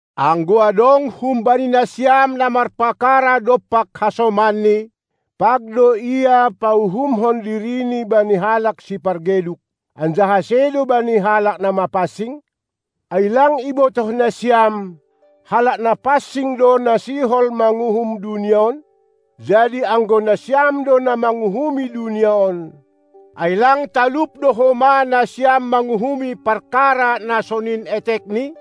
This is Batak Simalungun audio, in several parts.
Anggo adong humbani nasiam na marpakara dompak hasomanni, pag do ia pauhumhon dirini bani halak sipargeduk, anjaha sedo bani halak na mapansing? Ai lang ibotah nasiam, halak na pansing do na sihol manguhum dunia on? Jadi, anggo nasiam do na manguhumi dunia on, ai lang talup do homa nasiam manguhumi parkara na sonin etekni?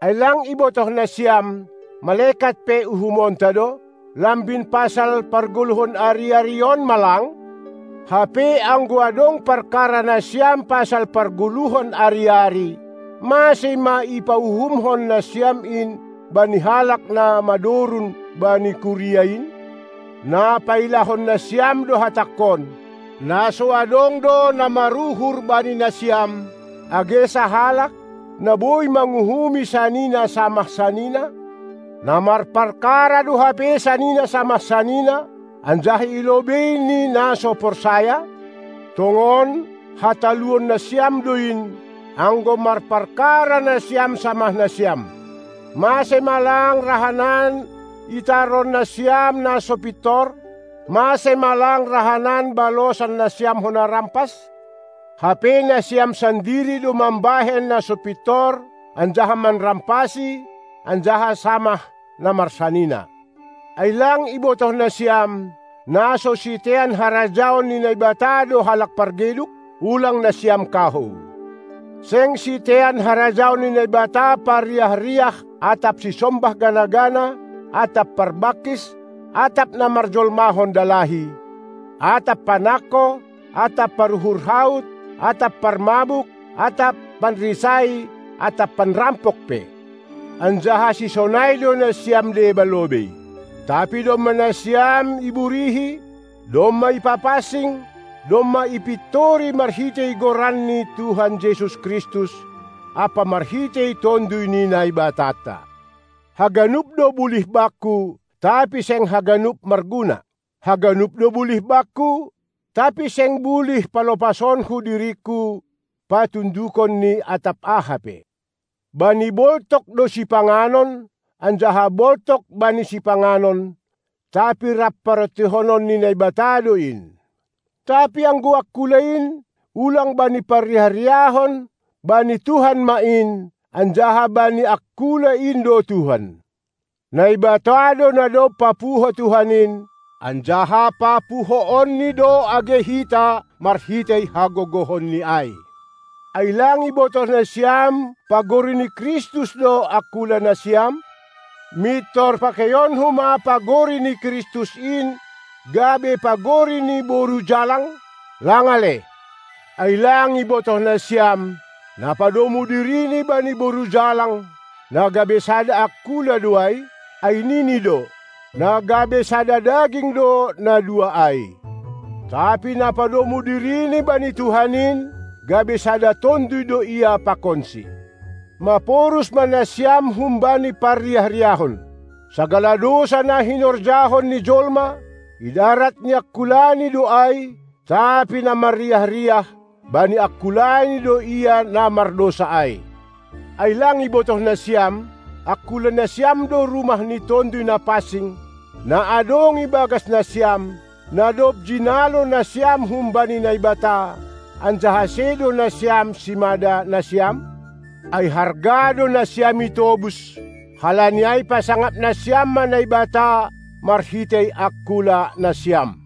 Ai lang ibotoh nasiam, malekat pe uhumonta do? Lambin pasal pargoluhon ari-ari on ma lang? Hape anggo adong parkara nasiam pasal pargoluhan ari-ari, mase ma ipauhumhon nasiam in bani halak na madorun bani kuria in? Na pailahon nasiam do hatangkon: Na so adong do na maruhur bani nasiam, age sahalak, na boi manguhumi sanina samah sanina? Na marpakara do hape sanina samah sanina, anjaha i lobei ni na so porsaya? Tongon, hataluon nasiam do in, anggo marpakara nasiam samah nasiam. Mase ma lang rahanan itaron nasiam na so pintor? Mase ma lang rahanan balosan nasiam hona rampas? Hape nasiam sandiri do mambahen na so pintor anjaha manrampasi, anjaha samah na marsanina. Ai lang ibotoh nasiam, na so sitean harajaon ni Naibata do halak pargeduk? Ulang nasiam kahou! Seng sitean harajaon ni Naibata parriah-riah atap sisombah gana-gana atap parbangkis atap na marjolmahon dalahi, atap panangko atap paruhur haut atap parmabuk atap panrisai atap panrampok pe. Anjaha sisonai do nasiam deba lobei. Tapi domma nasiam iburihi, domma ipapansing, domma ipintori marhitei Goran ni Tuhan Jesus Kristus ampa marhitei Tonduy ni Naibatanta. Haganup do bulih bakku, tapi seng haganup marguna. Haganup do bulih bakku, tapi seng bulih palopasonku diringku patundukon ni atap aha pe. Bani boltok do sipanganon anjaha boltok bani sipanganon, tapi rap parontihonon ni Naibata do in. Tapi anggo angkula in, ulang bani parriah-riahon, bani Tuhan ma in, anjaha bani angkula in do Tuhan. Naibata do na dob papuho Tuhan in, anjaha papuhoonNi do age hita marhitei hagogohonNi ai. Ai lang ibotoh nasiam pagori ni Kristus do angkula nasiam? Mintor pakeionku ma pagori ni Kristus in gabe pagori ni boru jalang? Lang ale! Ai lang ibotoh nasiam, na padomu dirini bani boru jalang, na gabe sada angkula do ai? Ai nini do: Na gabe sada daging do na dua ai. Tapi na padomu dirini bani Tuhan in, gabe sada tonduy do ia pakonSi. Maporus ma nasiam humbani parriah-riahon! Sagala dousa na hinorjahon ni jolma, idarat ni angkulani do ai, tapi na marriah-riah, bani angkulani do ia na mardousa ai. Ai lang ibotoh nasiam, angkula nasiam do rumah ni Tonduy Napansing, na adong ibagas nasiam, na dob jinalo nasiam humbani Naibata, anjaha sedo nasiam simada nasiam? Ai harga do nasiam itobus, halani ai pasangap nasiam ma Naibata marhitei angkula nasiam.